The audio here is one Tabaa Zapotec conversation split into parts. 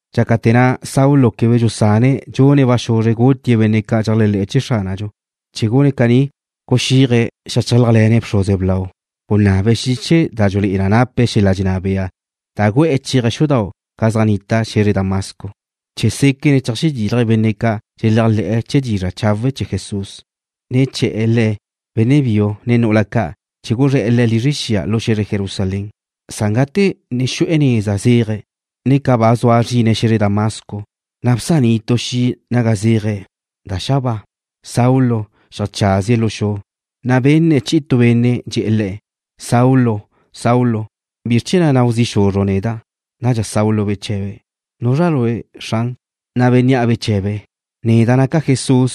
Dxácate̱ na' Saulo quebe dxusane̱' dxune̱' ba xuzre gutie̱' benne' ca' dxeléajle̱'e̱ chee̱ Xránadxu. Chee̱ gune̱' caní guxíaje̱' xeajchálajle̱ne̱' bxruze blau. Gunabe̱' xiche da dxulé'e na nape̱' xel-la' dxenná bea da gu'e̱ chéaje̱' xudau' ca' zaj nnita xe̱zre Damasco, chee̱ séquene̱' cheajxedílaje̱' benne' ca' dxeléajle̱'e̱ chee̱ dizra' chawe' chee̱ Jesús, ne che̱'e̱ le̱', benne' biu, ne nu'ula ca', chee̱ guzré̱'e̱ le̱' lizre xia lu xe̱zre Jerusalén. Na' gate ne xu'e̱ neza zéaje̱', ne ca ba zua zrine̱' xe̱zre Damasco, na' bsaní' tu xi' naga zéaje̱' da za' xabáa. Saulo xeajcházie̱' lu xu, na' benne̱' chi'i tu benne' dxe̱'e̱ le̱': ―Saulo, Saulo, ¿bizr chee̱ na' nau zi' xuzru' neda'? Nadxa Saulo bche̱be̱': ―¿Nuzra Lue', Xran? Na' bénnea' beche̱be̱': ―Neda' naca' Jesús,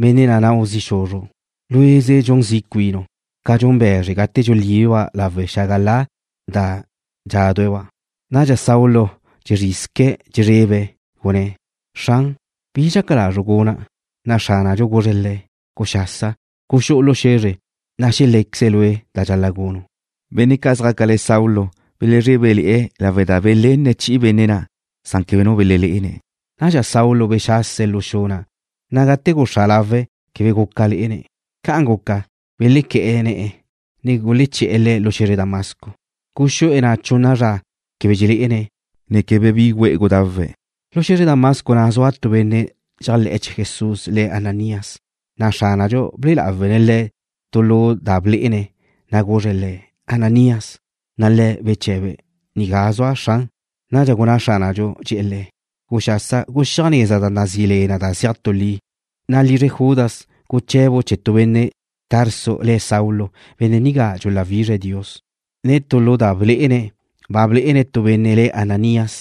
benne' na' nau zi' xuzru'. Lue'ze dxun zi' cuinu', ca dxun be̱zre gate dxulíbeba' lawe' xágala da dxádue̱'-ba'. Nadxa Saulo dxezrizque̱' dxezrebe̱', gunné̱': ―Xran, ¿bi dxaca lazru' guna'? Na' Xránadxu guzre̱' le̱': ―Guxasa, guxú'u lu xe̱zre, na' xelé̱queze̱' lue' da dxal-la' gunu'. Benne' ca' zjácale̱ Saulo belezrébele̱'e̱ lawe' da belenne̱' chi'i benne' na', san quebe nu belelé'ene̱'. Nadxa Saulo bexase̱' lu xu na', na' gate guxá' lawe̱', quebe guca lé'ene̱'. Ca' guca, belequé̱'e̱ ne̱'e̱, ne guleché̱'e̱ le̱' lu xe̱zre Damasco. Guzúe̱' na' chunna zra quebe dxelé'ene̱', ne quebe bi güe'e gudawe̱'. Lu xe̱zre Damasco na' zua tu benne' dxéajle̱'e̱ chee̱ Jesús le̱' Ananías, na' Xránadxu ble'e lawe̱' le̱' tu lu da ble'e le̱', na' guzre̱' le̱': ―Ananías. Na' le̱' beche̱be̱': ―Nigá zua', Xran. Nadxa gunná Xránadxu, dxe̱'e̱ le̱': ―Guxasa, guxíaj neza da nazí le na: Neza Li, na' lizre Judas guche̱bu' chee̱ tu benne' Tarso, le̱' Saulo. Benne' nigá dxuláwizre̱' Dios. Tu lu da blé'ene̱', ba blé'ene̱' tu benne' le̱' Ananías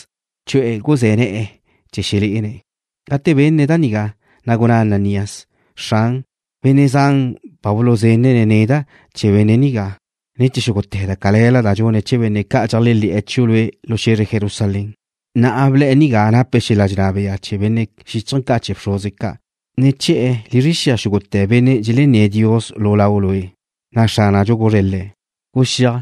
chu'e̱ guzé̱ ne̱'e̱ le̱' chee̱ xelé'ene̱'. Gate benne̱' da nigá, na' gunná Ananías: ―Xran, benne' zan ba buluzenne̱' neda' chee̱ benne' nigá, ne chee̱ xúgute̱ da cale̱la da dxune̱' chee̱ benne' ca' dxeléajle̱'e̱ chiu' Lue' lu xe̱zre Jerusalén. Na'a ble̱'e̱ nigá nape̱' xel-la' dxenná bea chee̱ benne' xíchaje̱ ca' chee̱ bxruze ca', chee̱ che̱'e̱ lizre xia xúgute̱ benne' dxelenné̱' Dios lu Lau' Lue'. Na' Xránadxu guzre̱' le̱': ―Guxíaj.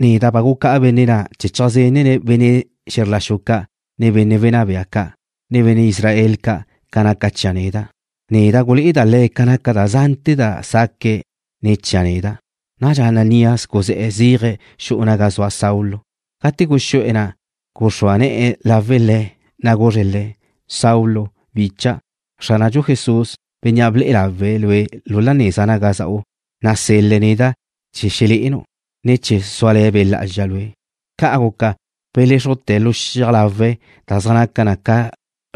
Neda' ba gucá'a benne' na' chee̱ cheajzenne̱' benne' xe̱zr la xu ca', ne benne' wenná bea ca', ne benne' Israel ca', ca naca chia' neda'. Neda' gulé'eda' le̱' ca naca da zante̱ da saque̱'e̱ ne̱ chia' neda'. Nadxa Ananías guzé̱'e̱ zéaje̱' xu'u naga zua Saulo. Gate guxú'e̱ na', guxrúa ne̱'e̱ lawe' le̱', na' guzre̱' le̱': ―Saulo, bicha'. Xránadxu Jesús, Bénnea' ble'e lawe̱' lue' la neza naga za'u, nasel-le̱' neda' chee̱ xelé'enu', ne chee̱ súale̱ Be' Lá'azxa lue'. Ca' guca beléxrujte̱ lu xiaj lawe̱' da zaj naca ca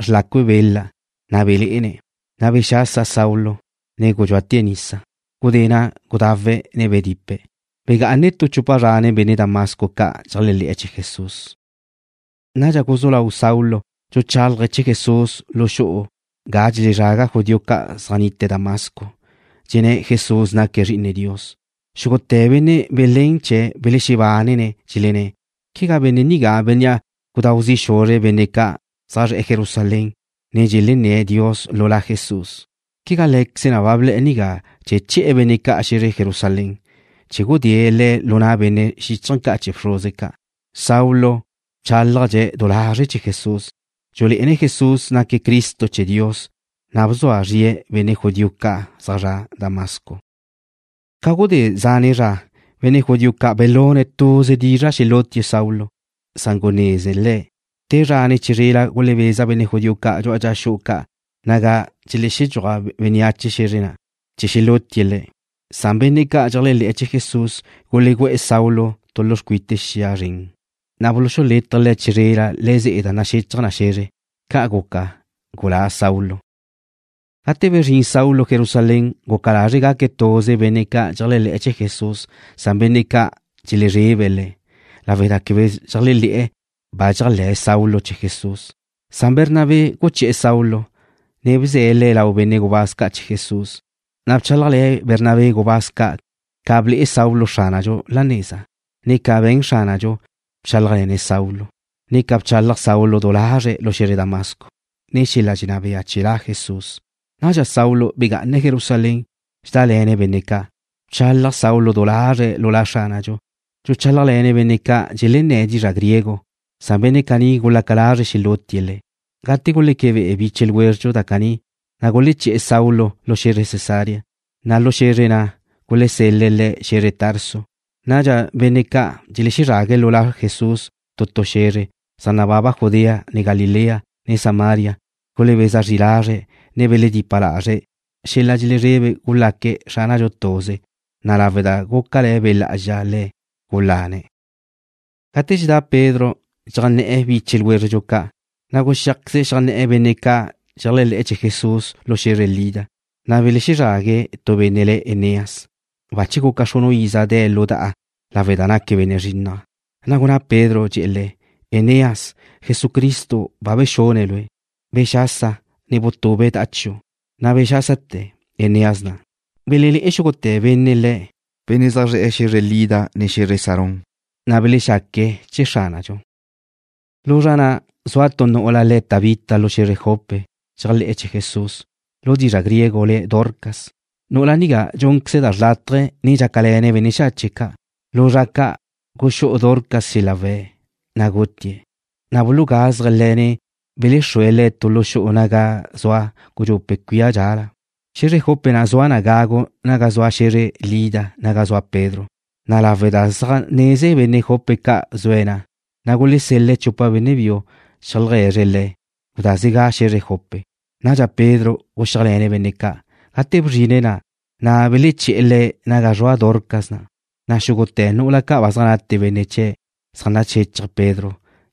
xrlacu bela, na' belé'ene̱'. Na' bexasa Saulo, ne gudxúate̱' nisa. Gudé na' gudawe̱', ne bedipe̱'. Begá'ane̱' tu chupa zra nen benne' Damasco ca' dxeléajle̱'e̱ chee̱ Jesús. Nadxa guzú lau Saulo dxuchálaje̱' chee̱ Jesús lu xu'u ga dxelezraga judío ca' zaj nnite̱' Damasco, dxenné̱' Jesús naque̱' Zri'ine Dios. Xúgute̱ benne' belénene̱' chee̱' belexebánene̱', dxelenné̱': ―¿Quegá benne' nigá bénnea' gudáu zi' xuzre̱' benne' ca' zaj zre̱'e̱ Jerusalén, benne' ca' dxelenné̱' Dios lu La Jesús? ¿Quegá lé̱queze̱' na' ble̱'e̱ nigá chee̱ che̱'e̱ benne' ca' xe̱zre Jerusalén chee̱ gudée̱' le̱' lu na' benne' xíchaje̱ ca' chee̱ bxruze ca'? Saulo bchálajdxe̱' du lazre̱' chee̱ Jesús, ne dxulé'ene̱' Jesús naque̱' Cristo chee̱ Dios, na' bzua zrie̱' benne' judío ca' zaj zre̱'e̱ Damasco. Ca gudé zane' zra, benne' judío ca' belune̱' tuze dizra' xelútie̱' Saulo. Gunezne̱' le̱' da nigá. Te zra ne chizrela gulebeza benne' judío ca' dxu'a dxa xu'u ca' naga dxelexedxúaj bénneache xe̱zre na', chee̱ xelútie̱' le̱'. Nadxa benne' ca' dxeléajle̱'e̱ chee̱ Jesús gulegú'e̱ Saulo tu lu xcuite lba zren, na' buluxulétaje̱' le̱' chizrela le̱'e̱ ze'e da naxechaj na xe̱zre. Ca' guca, gulá Saulo. Gate bezrín Saulo Jerusalén, guca lazre̱' gune̱' tuze benne' ca' dxeléajle̱'e̱ chee̱ Jesús, san benne' ca' dxelezrebe̱' le̱' lawe' da quebe dxeléajle̱'e̱ ba dxéajle̱'e̱ Saulo chee̱ Jesús. Bernabé guché̱'e̱ Saulo, ne bze̱' le̱' lau benne' gubáz ca' chee̱ Jesús. Na' bchálajle̱ Bernabé gubáz ca' ca ble'e Saulo Xránadxu la neza, ne ca be̱n Xránadxu bchálajle̱ne̱' Saulo, ne ca bchalaj Saulo du lazre̱' lu xe̱zre Damasco nen xel-la' dxenná bea chee̱ La Jesús. Nadxa Saulo begá'ane̱' Jerusalén, dxedále̱ne̱' benne' ca'. Bchalaj Saulo du lazre̱' lu La Xránadxu, dxuchálajle̱ne̱' benne' ca' dxelenné̱' dizra' griego, san benne' caní gulaca lazre̱' xelútie̱' le̱'. Gate guleque be'e biche ljwézredxu da caní, na' guleché̱'e̱ Saulo lu xe̱zre Cesarea, na' lu xe̱zre na' gulesel-le̱' le̱' xe̱zre Tarso. Nadxa benne' ca' dxelezrague̱' lu La Jesús tu tu xe̱zre zaj nababa Judea, ne Galilea, ne Samaria, gulebeza zri lazre̱', ne beledipa lazre̱'. Xel-la' dxelezrebe gulaque̱' Xránadxu tuze, na' lawe' da gúcale̱ Be' Lá'azxa le̱', gulane̱'. Gate dxedá Pedro dxeajnné̱'e̱ biche ljwézredxu ca', na' guxíajqueze̱' xeajnné̱'e̱ benne' ca' dxeléajle̱'e̱ chee̱ Jesús lu xe̱zre Lida. Na' bezrague̱' tu benne' le̱' Eneas, bache guca xrunu' iza de̱' lu da'a lawe' da naque̱' benne' zrinnaj. Na' gunná Pedro, dxe̱'e̱ le̱': ―Eneas, Jesucristo ba bexune̱' lue'. Bexasa, ne butube da'a chiu'. Na' bexásate̱ Eneas na'. Belelé'e xúgute̱ benne' le̱', benne' zaj zre̱'e̱ xe̱zre Lida, ne xe̱zre Sarón, na' belexaque̱' chee̱ Xránadxu. Lu zra na' zua tu nu'ula le̱' Tabita lu xe̱zre Jope. Dxéajle̱'e̱ chee̱ Jesús. Lu dizra' griego le̱' Dorcas. Nu'ula nigá dxúnqueze̱' da xrlátaje, ne dxácale̱ne̱' benne' xache' ca'. Lu zra ca' guxú'u Dorcas xel-la' we̱', na' gutie̱'. Na' bulugazje̱' le̱', ne belexrue̱' le̱' tu lu xu'u naga zua gudxupe' cuía dxala. Xe̱zre Jope na' zua na gagu naga zua xe̱zre Lida naga zua Pedro, na' lawe' da zaj neze benne' Jope ca' zue̱' na', na' gulesel-le̱' chupa benne' biu cheajlegue̱zre̱' le̱': ―Gudázega xe̱zre Jope. Nadxa Pedro guxíajle̱ne̱' benne' ca'. Gate bzrine̱' na', na' beleché̱'e̱ le̱' naga zrua Dorcas na', na' xúgute̱ nu'ula ca' ba zaj nate benne' chie̱' zaj naxéchaje̱' Pedro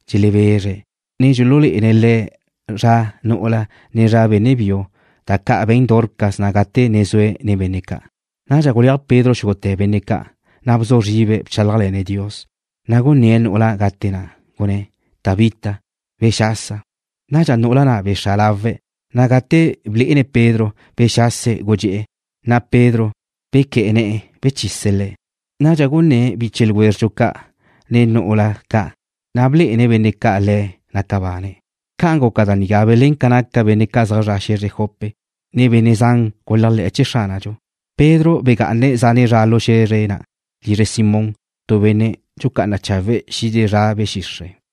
dxelebezre̱', ne dxululé'ene̱' le̱' zra nu'ula, ne zra benne' biu, da ca' be̱n Dorcas na' gate ne zue̱' nen benne' ca'. Nadxa guleaj Pedro xúgute̱ benne' ca', na' bzu zribe̱' bchálajle̱ne̱' Dios. Na' gunné̱'e̱ nu'ula gate na', gunné̱': ―Tabita, bexasa. Nadxa nu'ula na' bexá' lawe̱', na' gate blé'ene̱' Pedro, bexase̱' gudxé'e̱. Na' Pedro bequé̱'e̱ ne̱'e̱, bechise̱' le̱'. Nadxa gunné̱' biche ljwézredxu ca', ne nu'ula ca' ba gute benne' biu chee̱', na' blé'ene̱' benne' ca' le̱' naca bane̱'. Ca guca da nigá belén ca naca benne' zaj zre̱'e̱ xe̱zre Jope, na' benne' zan guléajle̱'e̱ chee̱ Xránadxu. Pedro begá'ane̱' zane' zra lu xe̱zre na' lizre Simón, tu benne' dxucá'ana chawe' xide zra be̱ xixre'.